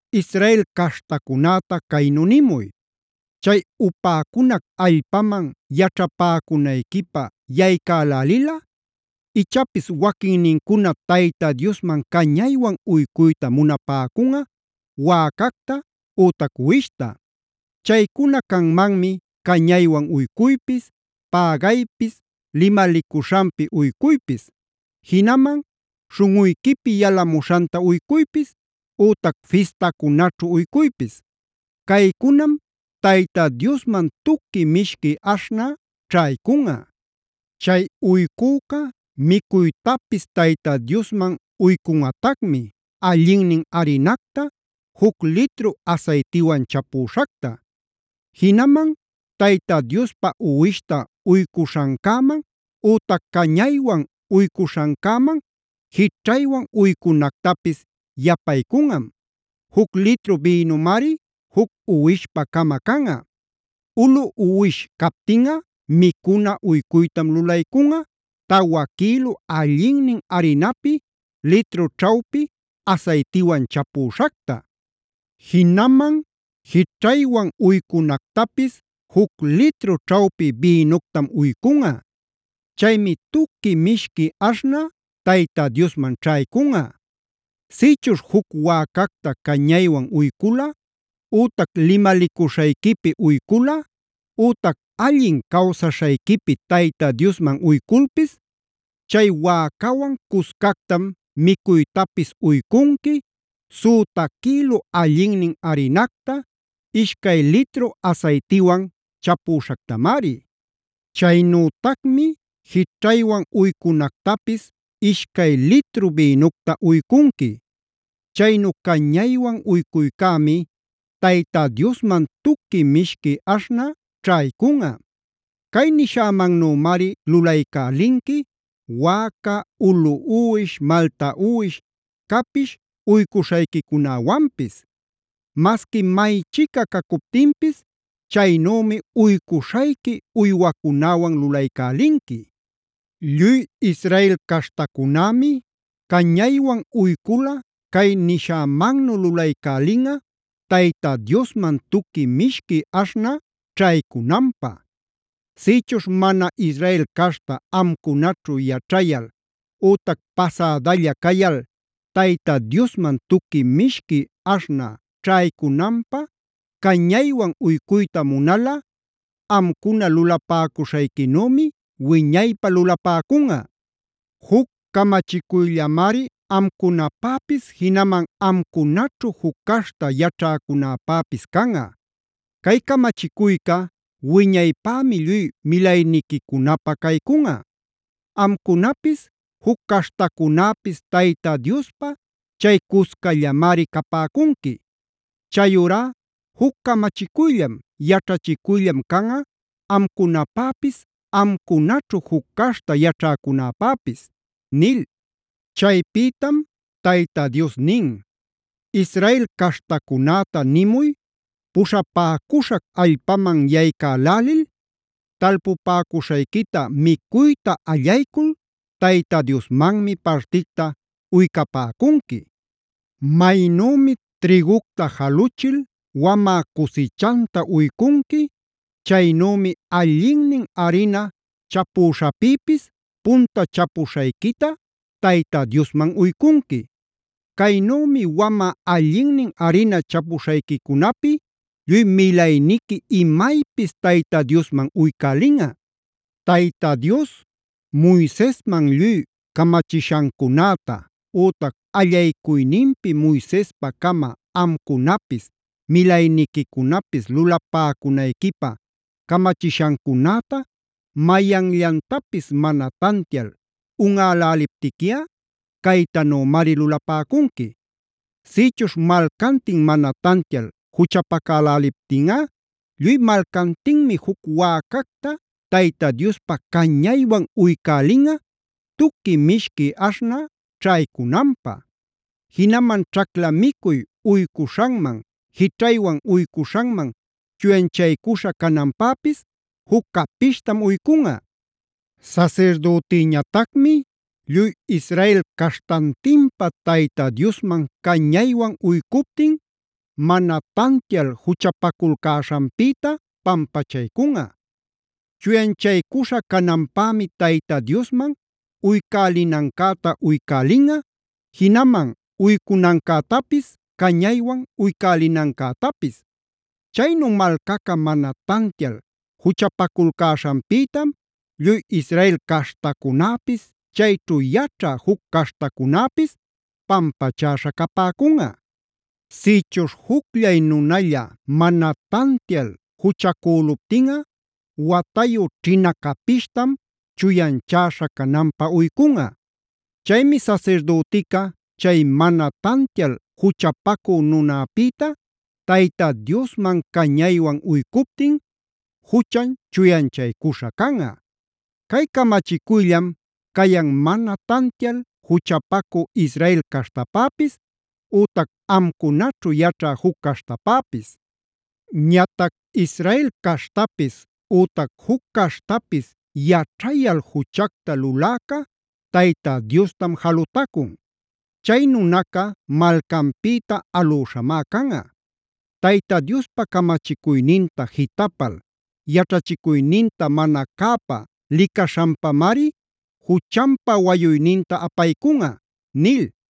“Israel caśhtacunäta caynu nimuy: ‘Chay upäcunac allpaman yaćhapäcunayquipä yaycälälilꞌa, ichapis waquinnincuna Tayta Diosman cañaywan uycuyta munapäcunꞌa wäcacta ütac uwishta. Chaycuna canmanmi cañaywan uycuypis, pägaypis, limalicuśhanpi uycuypis; jinaman śhunꞌuyquipi yalamuśhanta uycuypis, ütac fistacunaćhu uycuypis. Caycunam Tayta Diosman tuqui mishqui aśhnä ćhaycunꞌa. Chay uycüca micuytapis Tayta Diosman uycunꞌatacmi, allinnin arinacta juc litru asaytiwan chapüśhacta. Jinaman Tayta Diospä uwishta uycuśhancäman ütac cañaywan uycuśhancäman jićhaywan uycunactapis yapaycunꞌam; juc litru bïnumari juc uwishpa-cama canꞌa. Ulu uwish captinꞌa micuna uycuytam lulaycunꞌa, tawa quïlu allinnin arinapi, litru ćhawpi asaytiwan chapüśhacta. Jinaman jićhaywan uycunactapis juc litru ćhawpi bïnuctam uycunꞌa. Chaymi tuqui mishqui aśhnä Tayta Diosman ćhaycunꞌa. Sïchuśh juc wäcacta cañaywan uyculꞌa ütac limalicuśhayquipi uyculꞌa, ütac allin cawsaśhayquipi Tayta Diosman uyculpis, chay wäcawan cuscactam micuytapis uycunqui, süta quïlu allinnin arinacta, ishcay litru asaytiwan chapüśhactamari. Chaynütacmi jićhaywan uycunactapis ishcay litru bïnucta uycunqui. Chaynu cañaywan uycuycämi Tayta Diosman tuqui mishqui aśhnä ćhaycunꞌa. Cay nishämannümari lulaycälinqui: wäca, ulu uwish, malta uwish, capish uycuśhayquicunäwanpis. Masqui maychica cacuptinpis chaynümi uycuśhayqui uywacunäwan lulaycälinqui. Lluy Israel caśhtacunämi cañaywan uyculꞌa cay nishämannu lulaycälinꞌa Tayta Diosman tuqui mishqui aśhnä ćhaycunanpä. “ ‘Sïchuśh mana Israel caśhta amcunaćhu yaćhayal ütac pasädalla cayal Tayta Diosman tuqui mishqui aśhnä ćhaycunanpä cañaywan uycuyta munalꞌa amcuna lulapäcuśhayquinümi wiñaypä lulapäcunꞌa. Juc camachicuyllamari amcunapäpis jinaman amcunaćhu juc caśhta yaćhäcunäpäpis canꞌa. Cay camachicuyca wiñaypämi lluy milayniquicunapä caycunꞌa. Amcunapis juc caśhtacunäpis Tayta Diospä chay cuscallamari capäcunqui. Chayurá juc camachicuyllam, yaćhachicuyllam canꞌa amcunapäpis amcunaćhu juc caśhta yaćhäcunäpäpis’”a nil. Chaypïtam Tayta Dios nin: “Israel caśhtacunäta nimuy: ‘Puśhapäcuśhac allpaman yaycälälil, talpupäcuśhayquita micuyta allaycul Tayta Diosmanmi particta uycapäcunqui. Maynümi trïgucta jaluchil wamä cusichanta uycunqui, chaynümi allinnin arina chapüśhäpïpis punta chapuśhayquita Tayta Diosman uycunqui. Caynümi wamä allinnin arina chapuśhayquicunapi lluy milayniqui imaypis Tayta Diosman uycälinꞌa. “ ‘Tayta Dios Moisesman lluy camachishancunäta, ütac allaycuyninpi Moisespa-cama amcunapis, milayniquicunapis lulapäcunayquipä camachishancunäta, mayanllantapis mana tantial unꞌäläliptiquiꞌa caytanümari lulapäcunqui: Sïchuśh malcantin mana tantial juchapacäläliptinꞌa lluy malcantinmi juc wäcacta Tayta Diospä cañaywan uycälinꞌa tuqui mishqui aśhnä ćhaycunanpä. Jinaman ćhacla micuy uycuśhanman, jićhaywan uycuśhanman chuyanchaycuśha cananpäpis juc capishtam uycunꞌa. Sasirdütiñatacmi lluy Israel caśhtantinpä Tayta Diosman cañaywan uycuptin mana tantial juchapaculcäśhanpïta pampachaycunꞌa. Chuyanchaycuśha cananpämi Tayta Diosman uycälinancäta uycälinꞌa, jinaman uycunancätapis, cañaywan uycälinancätapis. Chaynu malcaca mana tantial juchapaculcäśhanpïtam lluy Israel caśhtacunäpis, chayćhu yaćhä juc caśhtacunäpis pampachäśha capäcunꞌa. “ ‘Sïchuśh jucllay nunalla mana tantial juchacüluptinꞌa watayu ćhina capishtam chuyanchäśha cananpä uycunꞌa. Chaymi sasirdütica chay mana tantial juchapacü nunäpïta Tayta Diosman cañaywan uycuptin juchan chuyanchaycuśha canꞌa.b Cay camachicuyllam cayan mana tantial juchapacü Israel caśhtapäpis ütac amcunaćhu yaćhä juc caśhtapäpis. “ ‘Ñatac Israel caśhtapis ütac juc caśhtapis yaćhayal juchacta luläca Tayta Diostam jalutacun. Chay nunaca malcanpïta alüśhamá canꞌa. Tayta Diospa camachicuyninta jitapal, yaćhachicuyninta mana cäpa licaśhanpamari juchanpa wayuyninta apaycunꞌa’” nil.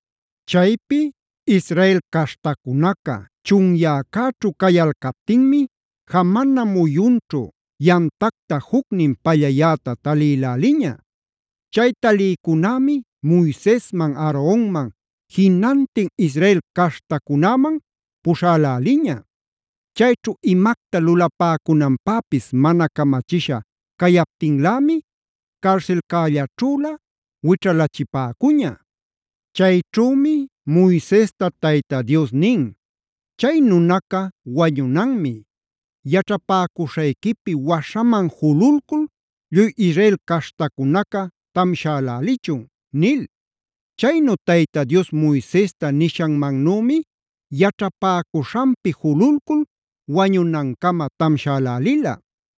Chaypi Israel caśhtacunaca chunyäcäćhu cayalcaptinmi jamana muyunćhu yamtacta jucnin pallayäta talïläliña. Chay talïcunämi Moisesman, Aaronman, jinantin Israel caśhtacunäman puśhälälila. Chayćhu imacta lulapäcunanpäpis mana camachisha cayaptinlämi carsilcällaćhülä wićhalachipäcula Chayćhümi Moisesta Tayta Dios nin: “Chay nunaca wañunanmi. Yaćhapäcuśhayquipi waśhaman jululcul lluy Israel caśhtacunaca tamshalälichun” nil. Chaynu Tayta Dios Moisesta nishanmannümi yaćhapäcuśhanpi jululcul wañunancama tamshälälila.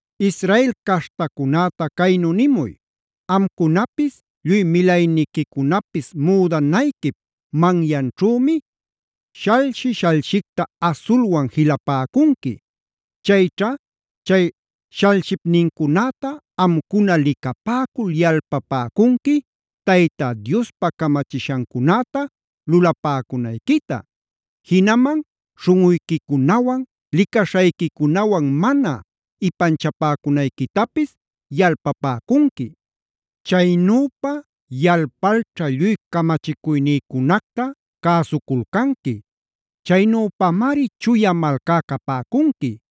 “Israel caśhtacunäta caynu nimuy: ‘Amcunapis lluy milayniquicunapis müdanayquip manyanćhümic shalshi-shalshicta asulwan jilapäcunqui. Chayćha chay shalshipnincunäta amcuna licapäcul yalpapäcunqui Tayta Diospa camachishancunäta lulapäcunayquita; jinaman śhunꞌuyquicunawan licaśhayquicunawan mana ipanchapäcunayquitapis yalpapäcunqui. Chaynüpa yalpalćha lluy camachicuynïcunacta cäsuculcanqui. Chaynüpamari chuya malcá capäcunqui.